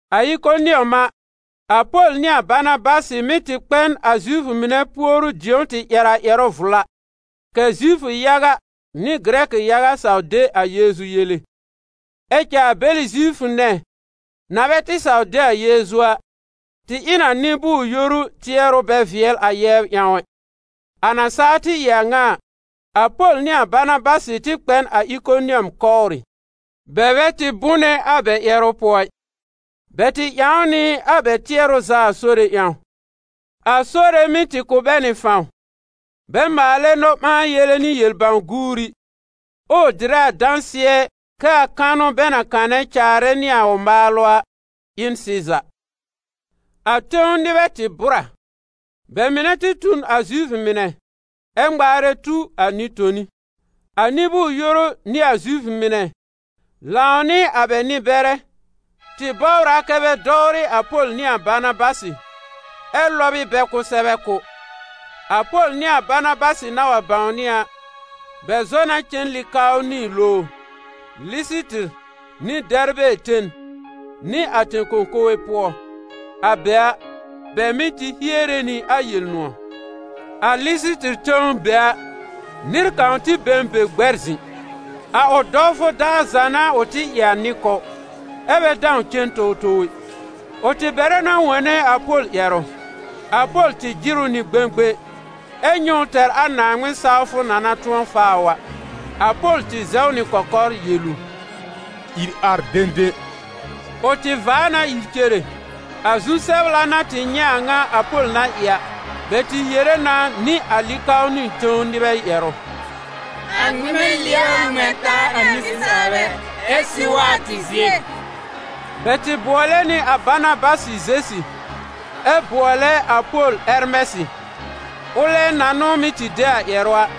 A Ɩkonɩɔm a, a Pol nɩ a Banabasɩ mɩ́ tɩ kpɛ n a Zifʋ mɩnɛ puoru-dĩ̀ó tɩ ƴɛr a ƴɛrʋ vla kɛ̀ Zifʋ yaga nɩ Gɩrɛkɩ yaga saw de a Yeezu yele. Ɛ cɛ a bɛlɩ Zifʋ nɛ na bɛ tɩ saw de a Yeezu a, tɩ ɩ na a nɩ-bʋʋr-yoru tɩɛrʋ bɛ vɩɛl a yɛbr ƴãw ɛ. A na saa tɩ ɩ a ŋa a, a Pol nɩ a Banabasɩ tɩ kpɛ n a Ɩkonɩɔm kɔwrɩ; bɛ bɛ tɩ bʋ́nɛ a bɛ ƴɛrʋ pʋɔ ɩ. Bɛ tɩ ƴãw nɩ a bɛ tɩɛrʋ za a Sore ƴãw. A Sore mɩ́ tɩ kʋ̀ bɛ nɩ fãw bɛ maalɛ nɔ-ɓãa-yele nɩ yel-bãw-guuri, ʋʋ dɩrɛ a dãsɩɛ kɛ a kanʋ bɛ na kanɛ càarɛ nɩ a ʋ maalʋ a ɩ n sɩza. A tẽw nɩbɛ tɩ bʋ́r a: bɛ mɩnɛ tɩ tu n a Zifʋ mɩnɛ, ɛ ŋmaarɛ tu a nɩ-toni. A nɩ-bʋʋr-yoru nɩ a Zifʋ mɩnɛ, lãw nɩ a bɛ nɩ-bɛrɛ, tɩ bɔbr a kɛ́ bɛ dɔwrɩ a Pol nɩ a Banabasɩ, ɛ lɔb ɩ bɛ kʋsɛbɛ kʋ́. A Pol nɩ a Banabasɩ na wa bãwnɩ a, bɛ zɔ na cen Likaoni lowr, Lɩsɩtɩr nɩ Dɛrbe ten nɩ a tẽ-kõkowe pʋɔ. A be a, bɛ mɩ̀ tɩ hiere nɩ a Yel-nʋ̃ɔ̀. A Lɩsɩtɩr tẽw be a, nɩr kãw tɩ be n be gbɛr zɩ̃; a ʋ dɔwfʋ daar za n'a ʋ tɩ ɩ a nɩ-kɔw, ɛ bɛ dãw cen towtow ɛ. Ʋ tɩ bɛrɛ na wone a Pol ƴɛrʋ. A Pol tɩ jɩr ʋ nɩ gbẽgbẽ, ɛ nyɛ̃ ʋ tɛr a Naaŋmɩn sawfʋ a na tʋ̃ɔ faa ʋ. A Pol tɩ zɛw nɩ kɔkɔr yel ʋ: «Ìr ar dẽdẽ!» Ʋ tɩ vaa na ìr cere. A zu-sɛbla na tɩ nyɛ̃ a a ŋa a Pol na ɩ a, bɛ tɩ yere na nɩ a Likaoni tẽw nɩbɛ ƴɛrʋ: «A ŋmɩmɛ lɩɛb a ŋmɛ̃ taa nɩ a nɩsaalbɛ, ɛ siw wa a tɩ zie.» Bɛ tɩ bʋɔlɛ nɩ a Banabasɩ Zesɩ, ɛ bʋɔlɛ a Pol Ɛrmɛsɩ, ʋlɛ na n'ʋ mɩ́ de a ƴɛrʋ a.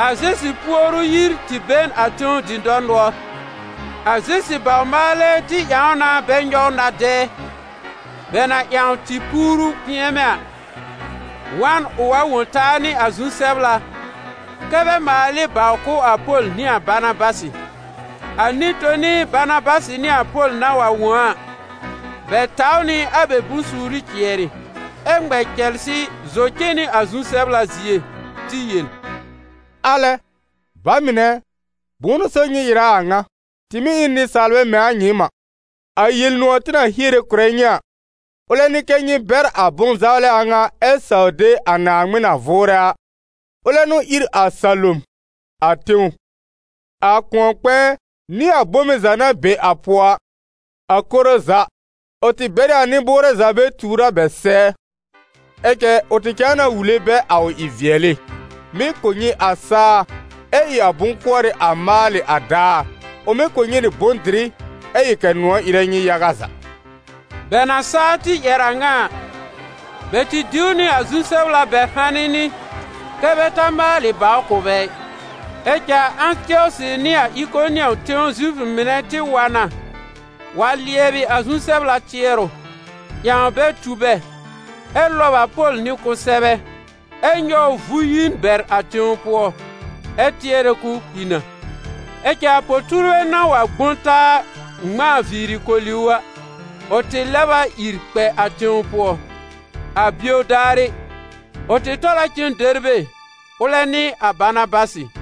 A Zesɩ puoru yir tɩ be n a tẽw dɩ̃dɔ-nʋɔr. A Zesɩ bawr-maalɛ tɩ ƴãw na bɛ nyɔw na-dɛɛ, bɛ na ƴãw tɩ-puuru pɩɛmɛ a, wa n ʋ wa wõ taa nɩ a zu-sɛbla kɛ́ bɛ maalɩ bawr kʋ̀ a Pol nɩ a Banabasɩ. A nɩ-toni Banabasɩ nɩ Pol na wa wõ a a, bɛ taw nɩ a bɛ bʋ̃-suuri cɩɛrɩ, ɛ ŋmɛ cɛlsɩ zɔ cen nɩ a zu-sɛbla zie, tɩ yel: «Alɛ! Ba-mɩnɛ ɛ, bʋ̃ʋ n'ʋ so nyɩ ɩrɛ a a ŋa? Tɩ mɩ̀ ɩ n nɩsaalbɛ mɛ̃ a nyɩɩm a! A Yel-nʋ̃ɔ̀ tɩ na hiere kʋ̀rɛ nyɩ a, ʋlɛ n'ɩ kɛ́ nyɩ bɛr a bʋ̃-zawlɛ a ŋa ɛ saw de a Naaŋmɩn na vʋʋrɛ a, ʋlɛ n'ʋ ír a salom, a tẽw, a kʋ̃ɔ-kpɛ̃ɛ nɩ a bome za na be a pʋɔ a. A koro za, ʋ tɩ bɛr ɩ a nɩ-bʋʋrɛ za bɛ tuur a bɛ sɛɛ. Ɛ cɛ ʋ tɩ cãa na wule bɛ a ʋ ɩ-vɩɛlɩ: mɩ́ kʋ̀ nyɩ a saa ɛ ɩ a bʋ̃-kʋɔrɩ a maalɩ a daar, ʋ mɩ́ kʋ̀ nyɩ nɩ bʋ̃-dɩrɩ ɛ ɩ kɛ̀ nʋ̃ɔ̀ ɩrɛ nyɩ yaga za.» Bɛ na saa tɩ ƴɛr a a ŋa a, bɛ tɩ diw nɩ a zu-sɛbla bɛr hanɩ nɩ kɛ́ bɛ ta maalɩ bawr kʋ̀ bɛ ɩ. Ɛ cɛ a Ãtɩɔsɩ nɩ a Ɩkonɩɔm tẽw Zifʋ mɩnɛ tɩ wa na wa lɩɛbɩ a zu-sɛbla tɩɛrʋ, ƴãw bɛ tu bɛ, ɛ lɔb a Pol nɩ kʋsɛbɛ, ɛ nyɔw ʋ vu yi n bɛr a tẽw pʋɔ, ɛ tɩɛrɛ k'ʋʋ kpi na. Ɛ cɛ a po-tuurbɛ na tɩ wa gbõ taa ŋmãa viiri koli ʋ a, ʋ tɩ lɛb a ìr kpɛ a tẽw pʋɔ. A bio daarɩ, ʋ tɩ tɔl a cen Dɛrbe, ʋlɛ nɩ a Banabasɩ.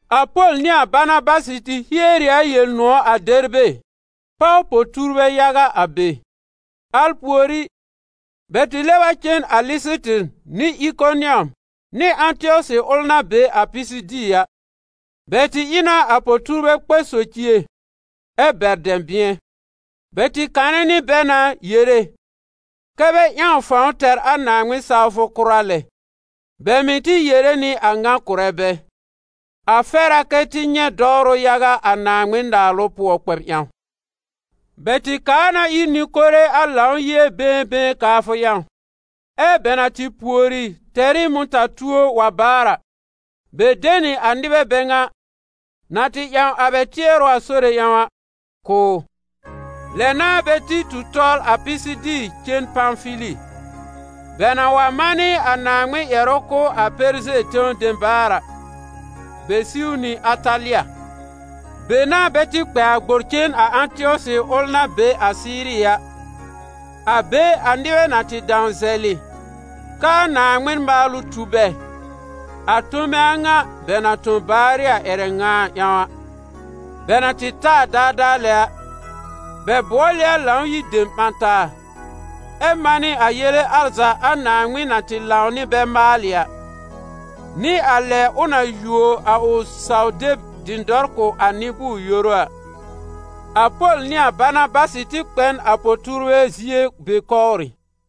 A Pol nɩ a Banabasɩ tɩ hier ɩ a Yel-nʋ̃ɔ̀ a Dɛrbe, páw po-tuurbɛ yaga a be. Al pùorí, bɛ tɩ lɛb a cen a Lɩsɩtɩr nɩ Ɩkonɩɔm nɩ a Ãtɩɔsɩ ʋl na be a Pisidi a. Bɛ tɩ ɩ na a po-tuurbɛ kpɛ socie ɛ bɛr dɛ̃bɩ̃ɛ. Bɛ tɩ kanɛ nɩ bɛ na yere kɛ́ bɛ ƴãw fãw tɛr a Naaŋmɩn sawfʋ kʋra lɛ, bɛ mɩ̀ tɩ yere nɩ a ŋa kʋ̀rɛ bɛ: «A fɛr a kɛ tɩ nyɛ̃ dɔwrʋ yaga a Naaŋmɩn-Naalʋ pʋɔ kpɛb ƴãw.» Bɛ tɩ kaa na ir nɩ-kore a Lãw-yie been been kaafʋ ƴãw, ɛ́ bɛ na tɩ pùori tɛr ɩ mʋta-tuo wa baar a, bɛ de nɩ a nɩbɛ bɛ ŋa, na tɩ ƴãw a bɛ tɩɛrʋ a Sore ƴãw a, kʋ̀ ʋ. Lɛ n'a bɛ tɩ tu tɔl a Pisidi cen Pãfili. Bɛ na wa manɩ a Naaŋmɩn ƴɛrʋ kʋ̀ a Pɛrze tẽw dem baar a, bɛ siw nɩ Atalɩa. Be n'a bɛ tɩ kpɛ a gbor cen a Ãtɩɔsɩ ʋl na be a Siiri a, a be a nɩbɛ na tɩ dãw zɛlɩ kɛ́ a Naaŋmɩn maalʋ tu bɛ, a tome a ŋa bɛ na tõ baarɩ a ƴɛrɛ ŋa a ƴãw a. Bɛ na tɩ ta a daadaa lɛ a, bɛ bʋɔl ɩ a Lãw-yir dem ɓã taa, ɛ manɩ a yele al za a Naaŋmɩn na tɩ lãw nɩ bɛ maalɩ a, nɩ a lɛ ʋ na yuo a ʋ saw-deb dɩ̃dɔr kʋ̀ a nɩ-bʋʋr-yoru a. A Pol nɩ a Banabasɩ tɩ kpɛ n a po-tuurbɛ zie be kɔwrɩ.